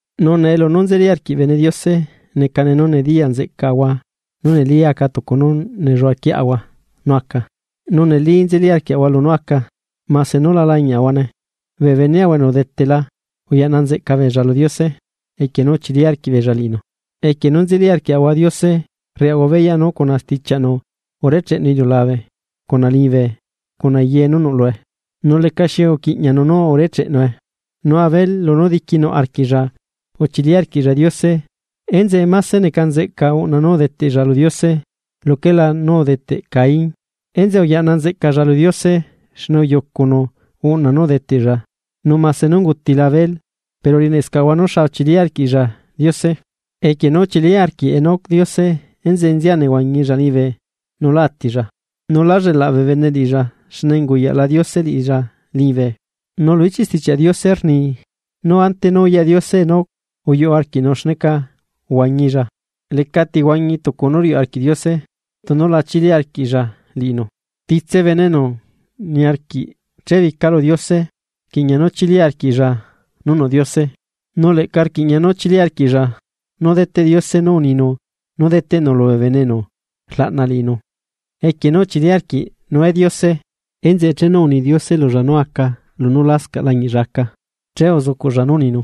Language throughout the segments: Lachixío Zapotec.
Nu nee lunú nzeli arquiꞌ bene Diose, necane nú nediyaꞌ nzeꞌcaꞌahua nú neli aca tucu nú nelluaꞌaquieꞌahua nú aca, nu neli nzeli arquiaꞌahua lunú aca, mase nú la lañiaꞌahuane. Bee beneꞌahua enu udetela uyaꞌna nzeꞌca beella lu Diose equie nú uchili arquiꞌbeella liꞌinu. Equie nú nzeli arquiaꞌahua Diose rriaꞌahua beyaꞌ nú cuna stichianu urecheꞌnu iliulabe cuna liñibe cuna ye nú nuꞌ lue, nu lecaxi uquiꞌñianu nú urecheꞌnue. Nu Abel lunú diquinuꞌ arquiꞌlla uchili arquiꞌlla Diose enzeꞌe máse neca nzeꞌca uꞌna nú udeteꞌlla lu Diose, luquela nú udeteꞌ Caín, enzeꞌe uyaꞌna nzeꞌcalla lu Diose xne uyucunu uꞌna nú udeteꞌlla nu máse nú ungutila Abel pero rieneꞌscaꞌahua nú xa uchili arquiꞌlla Diose. Equie nú uchili arquiꞌ Enoc Diose enzeꞌe nzia nehuañilla liñibe nu lá atilla, nu lá llelaꞌ bee bene liꞌilla xne unguyaꞌla Diose liꞌilla liñibe. Nu lu ichiꞌ Stichiaꞌ Diose rni: “Nú ante nú uyaꞌ Diose Enoc uyuꞌ arquiꞌnu xneca uhuañilla.” Lecati huañi tucu nú riuꞌ arquiꞌ Diose tunu la chili arquiꞌlla liꞌinu. Titse bene enu niarquiꞌ chebica lu Diose, rquiꞌña nú chili arquiꞌlla nú nuꞌ Diose nu leꞌca rquiꞌña nú chili arquiꞌlla nú deteꞌ Diose nú uninu nú deteꞌnu lubee bene enu rlaꞌna liꞌinu. Equie nú uchili arquiꞌ Noe Diose enzeꞌe chenu uni Diose lulla nú aca lunú lasca lañiꞌlla aca, che uzucuꞌlla nú uninu,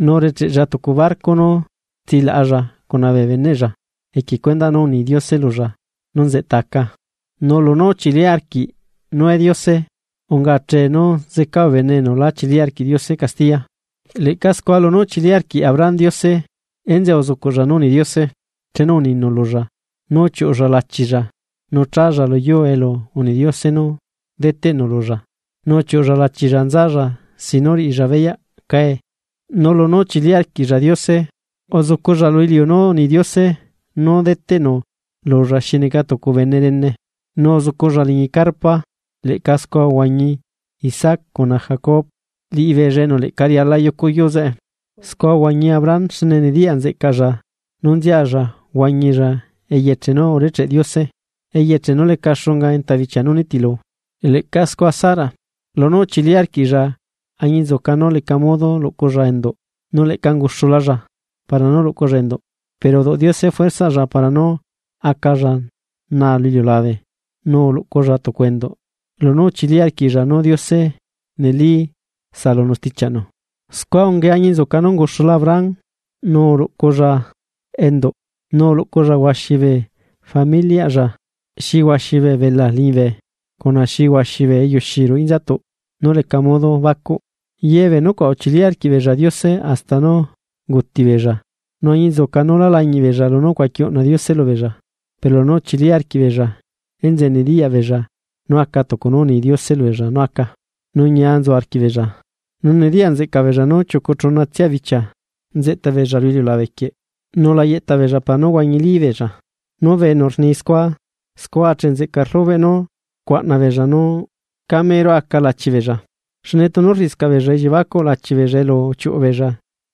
nu urecheꞌlla tucu barco nú tsilaꞌalla cuna bee beneꞌlla equie cuendaꞌ nú uni Diose lulla nú nzeꞌta aca. Nu lunú uchili arquiꞌ Noe Diose unga achee nú zeca bee bene enu lá chili arquiꞌ Diose castiya. Leꞌca scua lunú uchili arquiꞌ Abraham Diose, enzeꞌe uzucuꞌlla nú uni Diose chenu uninu lulla nú uchiuꞌulla lachilla nu challa lu yuu elu uni Diose nú deteꞌnu lulla, nu uchiuꞌulla lachilla nzalla sin nú riꞌilla beyaꞌ cae. Nu lunú uchili arquiꞌlla Diose, uzuculla lu iliu nú uni Diose nú deteꞌnu lulla xi neca tucu bene rene, nu uzuculla liñi carpa leꞌca scua uhuañi Isaac cuna Jacob liꞌibeella enu leꞌca riala yucu yuu zeꞌe. Scua uhuañi Abraham xne nediyaꞌ nzeꞌcaꞌlla nú nzialla huañilla eyeche nú urecheꞌ Diose, eyeche nú leca xunga enta bichia nú nitilu. Leꞌca scua Sara, lunú uchili arquiꞌlla añinzuca nú leca modo luꞌculla enduꞌ, nu leꞌca unguxulalla para nú luꞌculla enduꞌ, pero uduꞌ Diose fuerzaꞌlla para nú acalla naa lu iliulabe nu uluꞌculla tucu enduꞌ lunú uchili arquiꞌlla nú Diose neli saꞌalunu stichiaꞌnu. Scua ungae añinzuca nú unguxula Abraham nu uluꞌculla enduꞌ, nu uluꞌculla huaxi bee familiaꞌlla xi huaxi bee belaa liñibe, cuna xi huaxi bee eyuxi ruꞌu inzatuꞌ nú leca modo bacuꞌ. Ye bee benecuaꞌ uchili arquiꞌbeella Diose hasta nú unguti beella nu añinzuca nú lá lañiꞌ beella lunú ucuaqui uꞌna Diose lubeella pero lunú uchili arquiꞌbeella enzeꞌe nediyaꞌ beella nú aca tucu nú uni Diose lubeella nú aca, nu ñia nzu arquiꞌbeella. Nu nediyaꞌ nzeꞌcaꞌ beella nú chiucu chuna tsia bichia nzeꞌta beella lu iliulabe quieꞌ nu la yeꞌta beella para nú huañili beella. Nu bee enu rni scua. Scua achee nzeꞌca rlubeꞌ nú rcuaꞌna beella nú camero aca lachi beella. Xne tunu rriꞌiscaꞌ beella elliebacuꞌ lachi beella elu uchiuꞌu beella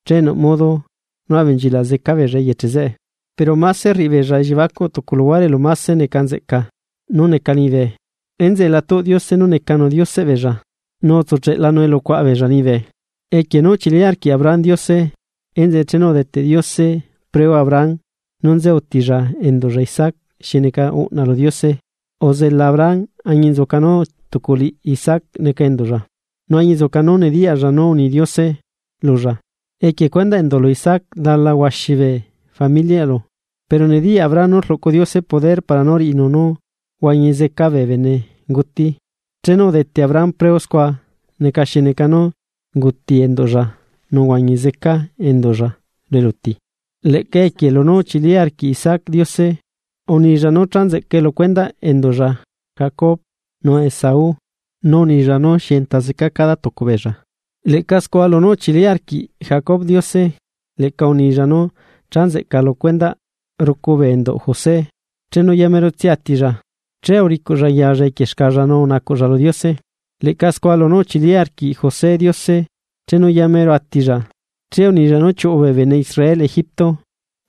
che nuꞌ modo nú abenchilaꞌ zeca beella eyeche zeꞌe. Pero máse rriꞌibeella elliebacuꞌ tucu luhuare elu máse neca nzeꞌca nú neca liñibe. Enzeꞌe la tuꞌ Diose nú necanu Dioseꞌ beella, nu utsucheꞌlanu elu cuaꞌa beella liñibe. Equie nú uchili arquiꞌ Abraham Diose enzeꞌe chenu udeteꞌ Diose preu Abraham nú nze utilla enduꞌlla Isaac xi neca uꞌna lu Diose, uzela Abraham añinzuca nú tuculiꞌ Isaac neca enduꞌlla, nu añinzuca nú nediyaꞌlla nú uni Diose lulla: “Equie cuendaꞌ enduꞌlu Isaac dala huaxi bee familiaꞌlu.” Pero nediyaꞌ Abraham nú rluꞌcu Diose poder para nú riꞌinu nú huañi zeca bee benenguti chenu udete Abraham preu scua neca xi neca nú unguti enduꞌlla nu uhuañi zeca enduꞌlla lu eluti. Leꞌca esquie lunú uchili arquiꞌ Isaac Diose, unilla nú cha nzeꞌcae lu cuendaꞌ enduꞌlla Jacob nu Esau, nu unilla nú xi enta zeca cada tucu beella. Leꞌca scua lunú uchili arquiꞌ Jacob Diose, leꞌca unilla nú cha nzeꞌca lu cuendaꞌ rucu bee enduꞌ José, chenu yamerotsia atilla. Che uricuꞌlla yalla equie xcalla nu unacuꞌlla lu Diose. Leꞌca scua, lunú uchili arquiꞌ José Diose, chenu yamero atilla, che unilla nú chiuꞌu bee bene Israel Egipto,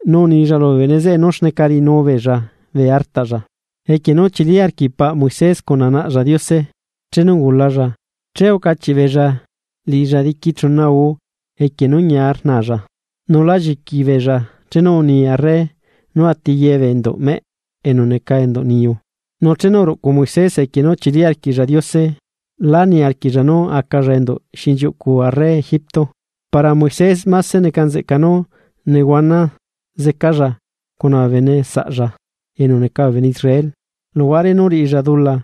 nu unilla lubee bene zeꞌe nú xneca riꞌinubeella bee artaꞌlla. Equie nú uchili arquiꞌ paꞌ Moisés cuna naꞌlla Diose, chenu ungulalla che ucachiꞌ beella liꞌilla diqui chuna guu equie nú ñia rnalla, nu lá lliqui beella chenu uni arre nú ati ye bee enduꞌ meꞌ enu neca enduꞌ niyu. Nu chenu uruꞌcu Moisés, equie nú uchili arquiꞌlla Diose, lá niarquiꞌlla nú acalla enduꞌ xinchiuꞌcu arre Egipto. Para Moisés, máse neca nzeꞌca nú nehuana zecalla cuna bee bene saꞌlla enu neca bee bene Israel, luhuare nú riꞌilla dula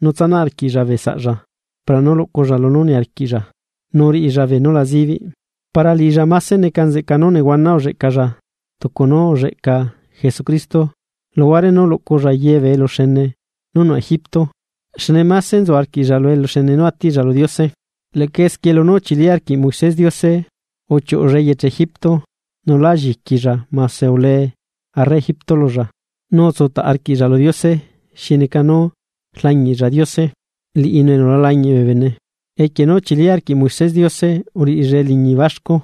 nú tsanaꞌ arquiꞌlla bee saꞌlla para nú luꞌculla lunú niarquiꞌlla nu riꞌilla bee nú la zibiꞌ. Para liꞌilla máse neca nzeꞌca nú nehuana ulleꞌcalla tucu nú ulleꞌca Jesucristo, luhuare nú luꞌculla ye bee eluxene nú nuꞌ Egipto xne máse nzu arquiꞌlla lu eluxene nú atiꞌlla lu Diose. Leꞌca esquie lunú uchili arquiꞌ Moisés Diose, uchiuꞌulla eyeche Egipto nu lá lliquilla mase ulee arre Egipto lulla. Nu utsutaꞌ arquiꞌlla lu Diose xi neca nú rlañiꞌlla Diose, liꞌinu enu la lañiꞌ bee bene. Equie nú uchili arquiꞌ Moisés Diose, uriꞌilla eliñi baxcu,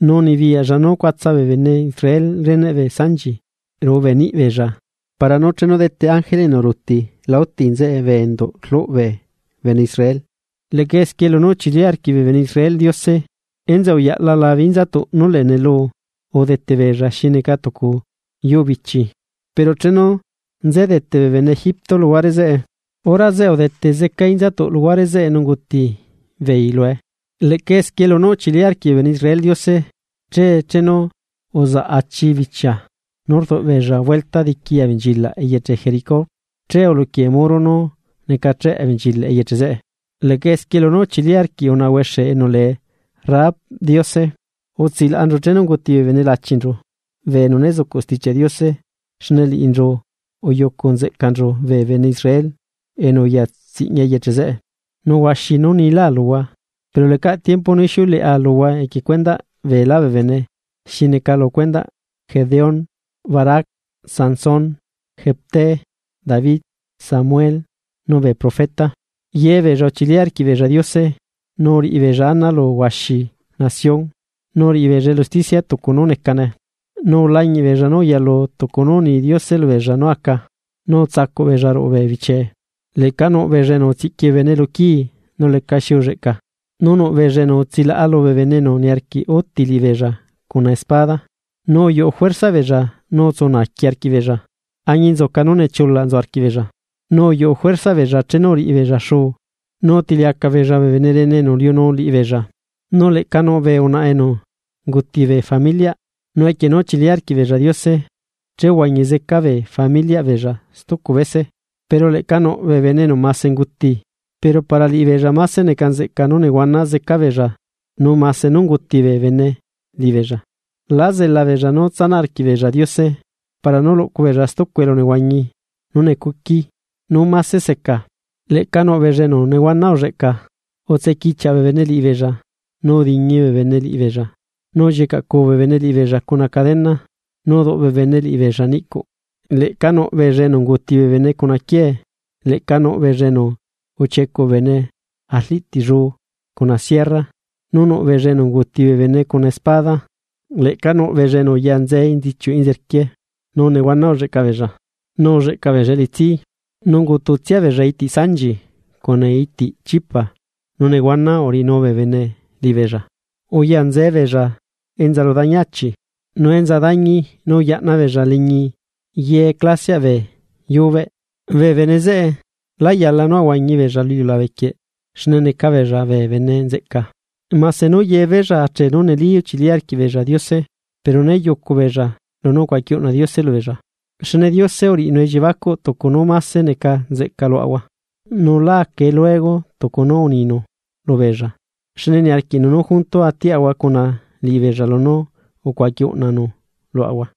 nu unibiyaꞌlla nú ucuatsa bee bene Israel reneꞌ bee sanchi ruꞌu bee niꞌi beella para nú chenu dete ángele enu ruuti la úti nzeꞌe bee enduꞌ rluꞌ bee bene Israel. Leꞌca esquie lunú uchili arquiꞌ bee bene Israel Diose. Enzeꞌe uyaꞌla labe inzatuꞌ nú lee nelu udete beella xi neca tucu yuu bichi. Pero chenu nzedete bee bene Egipto luhuare zeꞌe, hora zeꞌe udete zeca inzatuꞌ luhuare zeꞌe nu unguti beei lue. Leꞌca esquie lunú uchili arquiꞌ bee bene Israel Diose che chenu uzaꞌ achi bichia nú rduꞌ beella vuelta diqui abenchilaꞌ eyeche Jericó, che uluquie muro nú necacheꞌ abenchilaꞌ eyeche zeꞌe. Leꞌca esquie lunú uchili arquiꞌ unaꞌa huexe enu lee Rahab Diose, utsilaꞌanchu chenu unguti bee bene lachinchu, bee enu né zucuꞌ Stichiaꞌ Diose xne liꞌinchu uyucu nzeꞌcanchu bee bene Israel enu uya tsiꞌña eyeche zeꞌe. Nu huaxi nú niláa luhua, pero lecaꞌ tiempo nú ixiuleꞌa luhua equie cuendaꞌ beelá bee bene xi neca lu cuendaꞌ Gedeón, Barac, Sansón, Jefté, David, Samuel nu bee profeta. Ye beella uchili arquiꞌbeella Diose nu uriꞌibeella ana lu huaxi nación, nu uriꞌi beella elu usticia tucu nú necane, nu ulañiꞌ beella nú uyalu tucu nú uni Diose lubeella nú aca, nu utsacuꞌ beella ruꞌu bee bichiee. Leꞌca nuꞌ beella enu utsiꞌqui bee bene lu quii nu lecaxi ulleꞌca, nu nuꞌ beella enu utsilaꞌa lubee bene enu niarquiꞌ úti liꞌibeella cuna espada, nu uyuꞌu juerzaꞌ beella nu utsu naaqui arquiꞌbeella, añinzuca nú nechulaꞌ nzu arquiꞌbeella, nu uyuꞌu juerzaꞌ beella chenu uriꞌibeella xuu. Nu utiliacaꞌ beella bee bene rene enu uliunu liꞌibeella. Nu leꞌca nuꞌ bee unaꞌa enu unguti bee familiaꞌ, nu equie nú uchili arquiꞌbeella Diose, che uhuañi zeca bee familiaꞌ beella stucu bese. Pero leꞌca nuꞌ bee bene enu mase unguti, pero para liꞌibeella máse neca nzeꞌca nú nehuana zeca beella nu mase nú unguuti bee bene liꞌibeella, lá zela beella nú tsanaꞌ arquiꞌ beella Diose, para nú luꞌcu beella stucu elunehuañi nú necuqui nú máse seca. Leꞌca nuꞌ beella enu nehuana ulleꞌca, utsequichiaꞌ bee bene liꞌibeella, nu udiñi bee bene liꞌibeella, nu ullicaꞌcu bee bene liꞌibeella cuna cadena, nu uduꞌ bee bene liꞌibeella niꞌcuꞌ. Leꞌca nuꞌ beella enu unguuti bee bene cuna quiee, leꞌca nuꞌbeella enu uchiecuꞌ bee bene arliꞌtilluu cuna sierra, nu nuꞌ beella enu unguti bee bene cuna espada, leꞌca nuꞌ beella enu uyanze enzichiuꞌ enzerquie, nu nehuana ulleꞌca beella, nu ulleꞌca beella elitsi, nu ungututsia beella itiꞌ sanchi cuna itiꞌ chipa nu nehuana uriꞌinu bee bene liꞌibeella. Uyanzee beella enza lu dañi achi, nu enza dañi nu uyaꞌna beella liñi ye clasiaꞌ bee yubeꞌ. Bee bene zeꞌe lá yala nú ahuañi beella lu iliulabe quieꞌ xne neca beella bee bene nzeꞌca. Mase nú yebeella achee nú neli uchili arquiꞌbeella Diose, pero né yucubeella lunú ucuaqui uꞌna Diose lubeella. Xne Diose uriꞌinu elliebacuꞌ tucu nú máse neca nzeꞌca luaꞌahua, nu lá acae luego tucu nú uninu lubeella xne niarquiꞌnu nú junto atiaꞌahua cuna liꞌibeella lunú ucuaqui uꞌnanu luaꞌahua.